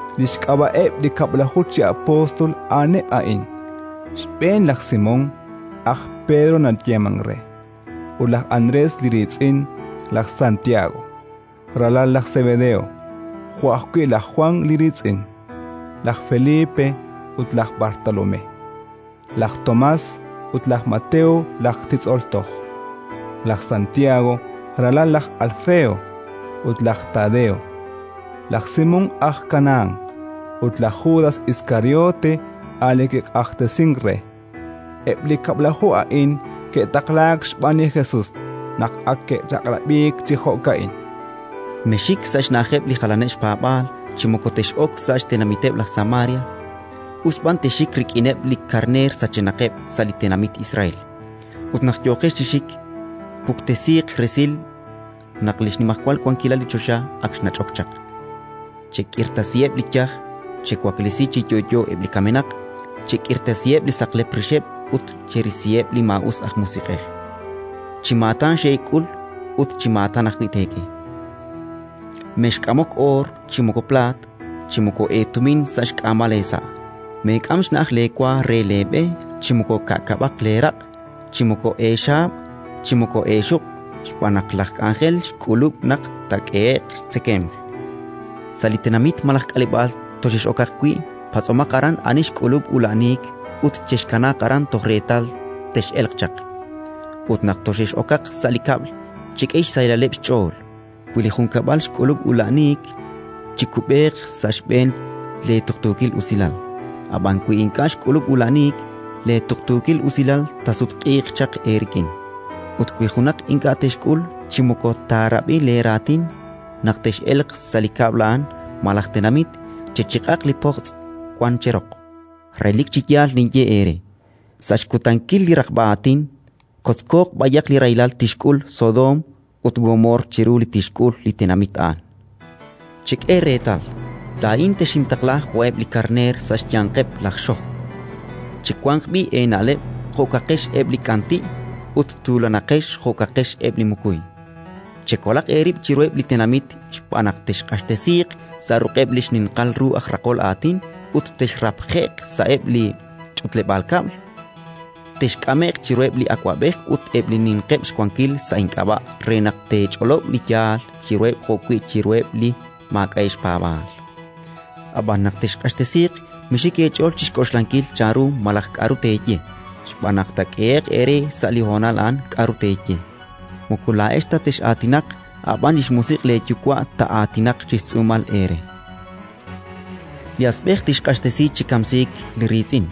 Li xk'ab'a'eb' li kab'laju chi apóstol a'aneb' a'in: xb'een, laj Simón, aj Pedro nayeemank re, ut laj Andrés li riitz'in; laj Santiago, ralal laj Sebedeo, jo'wi' laj Jwan li riitz'in; laj Felipe ut laj Bartolomé; laj Tomás ut laj Mateo laj titz'ol toj; laj Santiago, ralal laj Alfeo, ut laj Tadeo; laj Simón aj Kanahán ut laj Judas Iskariote, a' li kiq'axtesink re. Eb' li kab'laju a'in ke'taqlaak xb'aan li Jesus, naq ak ke'chaq'rab'iik chi jo'ka'in: “Mexxik sa' xna'ajeb' li jalaneb' xpaab'aal chi moko tex'ok sa' xtenamiteb' laj Samaria. Us b'an texxik rik'ineb' li karneer sachenaqeb' sa' li tenamit Israel. Ut naq yooqex chi xik, puktesiiq resil naq li xnimajwal wankilal li choxa ak xnach'ok chaq. Chek'irtasiheb' li yaj, chewaklesi chi yo'yo eb' li kamenaq, chek'irtasiheb' li saqlep rixeb' ut cherisiheb' li maa'us aj musiq'ej. Chi maatan xek'ul, ut chi maatan ajwi' teek'e. “Mexk'amok oor, chi moko plaat, chi moko eetumin sa' xk'aamal eesa'. Meek'am xna'aj leewa re leeb'e, chi moko ka'kab'aq leeraq', chi moko eexaab', chi moko eexuq', xb'aan naq laj k'anjel xk'ulub' naq taak'ehe'q xtzekemq. “Sa' li tenamit malaj k'aleb'aal toxex'okaq wi', patz'omaq aran ani xk'ulub' ula'aniik ut chexkanaaq aran toj reetal tex'elq chaq. Ut naq toxex'okaq sa' li kab'l, chek'e xsahilaleb' xch'ool. Wi li junkab'al xk'ulub' ula'aniik, chikub'eeq sa' xb'een leetuqtuukil usilal; ab'an, wi ink'a' xk'ulub' ula'aniik, leetuqtuukil usilal taasutq'iiq chaq eerik'in. Ut wi junaq ink'a' texk'ul chi moko taarab'i leeraatin, naq tex'elq sa' li kab'l a'an malaj tenamit, chechiq'aq li pojtz' wank cheroq. Relik chi yaal ninye eere: sa' xkutankil li raqb'a aatin kotzkooq b'ayaq li rahilal tixk'ul Sodoom ut Gomoor chiru li tixk'ul li tenamit a'an. “Chek'e reetal, laa'in texintaqla jo'eb' li karneer sa' xyanqeb' laj xojb'. Chiwanq b'i' eena'leb' jo'kaqex eb' li k'anti', ut tuulanaqex jo'kaqex eb' li mukuy. Chekolaq eerib' chiruheb' li tenamit, xb'aan naq texq'axtesiiq sa' ruq'eb' li xninqal ru aj raqol aatin ut texrapje'q sa'eb' li xch'utleb'aal kab'l. Texk'ame'q chiruheb' li awab'ej ut eb' li ninqeb' xwankil sa' ink'ab'a' re naq teech'olob' li yaal chiruheb' jo'wi' chiruheb' li maak'a'eb' xpaab'aal. Ab'an, naq texq'axtesiiq, mixik eech'ool chi xk'oxlankil chanru malaj k'aru teeye, xb'aan naq taak'ehe'q eere sa' li honal a'an k'aru teeye. Moko laa'ex ta tex'aatinaq, a' b'an li xMusiq' leeYuwa' taa'aatinaq chi xtz'uumal eere. “Li asb'ej tixq'axtesi chi kamsiik li riitz'in,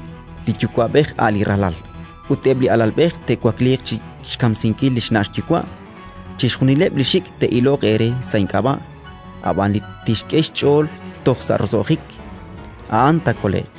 li yuwa'b'ej a' li ralal; ut eb' li alalb'ej te'wakliiq chi xkamsinkil xna' xyuwa'. Chixjunileb' xik' te'iloq eere sa' ink'ab'a'; ab'an li tixk'e xch'ool toj sa' roso'jik, a'an taakole'q.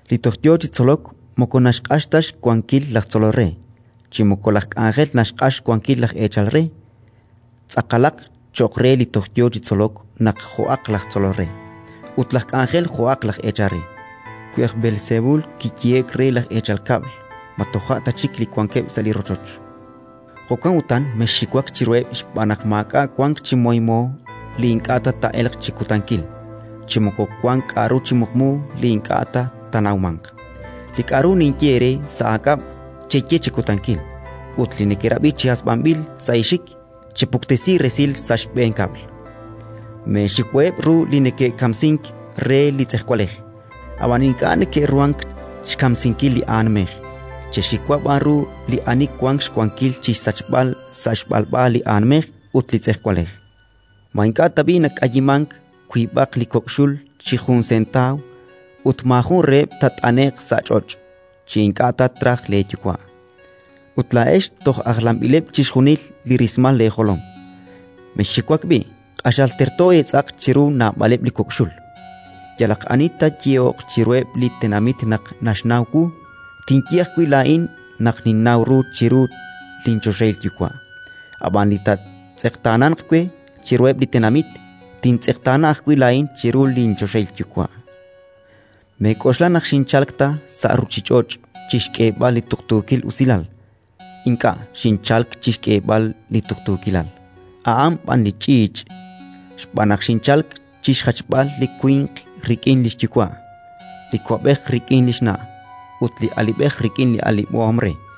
“Li toj yo chi tzolok moko naxq'ax ta xwankil laj tzolol re, chi moko laj k'anjel naxq'ax xwankil laj eechal re. Tz'aqalaq cho'q re li toj yo chi tzolok naq jo'aq laj tzolol re, ut laj k'anjel jo'aq laj eechal re. Wi aj Beelsebul kiyehe'k re laj eechal kab'l, ma toja' ta chik li wankeb' sa' li rochoch? “Jo'kan utan mexxiwak chiruheb', xb'aan naq maak'a' wank chi moymo li ink'a' ta taa'elq chi kutankil, chi moko wank k'aru chi muqmu li ink'a' ta taanawmanq. Li k'aru ninye eere sa' aak'ab', cheye chi kutankil; ut li nekerab'i chi hasb'anb'il sa' eexik, chepuktesi resil sa' xb'een kab'l. Meexiwaheb' ru li neke'kamsink re li tz'ejwalej, ab'an ink'a' neke'ruhank xkamsinkil li aanmej; chexiwa b'an ru li ani wank xwankil chi xsachb'al sa' xb'alb'a li aanmej ut li tz'ejwalej. “Ma ink'a' tab'i' nak'ayimank wiib'aq li kok' xul chi jun sentaaw? Ut maajun reheb' taat'ane'q sa' ch'och' chi ink'a' ta traj leeYuwa'. Ut laa'ex, toj ajlanb'ileb' chixjunil li rismal leejolom! Mexxiwak b'i': q'axal terto eetz'aq chiru naab'aleb' li kok' xul. “Yalaq ani taayehoq chiruheb' li tenamit naq naxnaw wu, tinye ajwi' laa'in naq ninnaw ru chiru linchoxahil Yuwa'. Ab'an li taatz'eqtaananq we chiruheb' li tenamit, tintz'eqtaana ajwi' laa'in chiru linchoxahil Yuwa'. “Meek'oxla naq xinchalk ta sa' ruuchich'och' chi xk'eeb'al li tuqtuukil usilal. Ink'a' xinchalk chi xk'eeb'al li tuqtuukilal, a'an b'an li ch'iich'. Xb'aan naq xinchalk chi xjachb'al li winq rik'in li xyuwa', li ko'b'ej rik'in li xna' ut li alib'ej rik'in li alib'om re;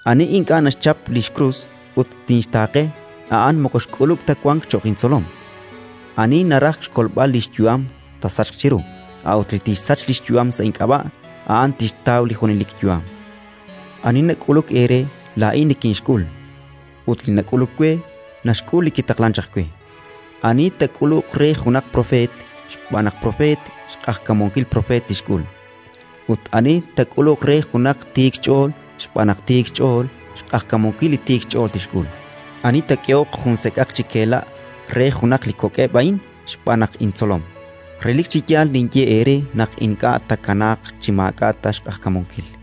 Ani ink'a' naxchap li xkrus ut tinxtaaqe, a'an moko xk'ulub' ta wank cho'q intzolom. Ani naraj xkolb'al li xyu'am, taasachq chiru; a'ut li tixsach li xyu'am sa' ink'ab'a', a'an tixtaw li junelik yu'am. “Ani nak'uluk eere, laa'in nikinxk'ul; ut li nak'uluk we, naxk'ul li kitaqlank chaq we. Ani taak'uluq re junaq propeet xb'aan naq propeet, xq'ajkamunkil propeet tixk'ul. Ut ani taak'uluq re junaq tiik xch'ool xb'aan naq tiik xch'ool, xq'ajkamunkil tiik xch'ool tixk'ul. Ani taak'ehoq jun sek'aq chi kela' re junaq li kok'eb' a'in xb'aan naq intzolom, relik chi yaal ninye eere naq ink'a' taakanaaq chi maak'a' ta xq'ajkamunkil”.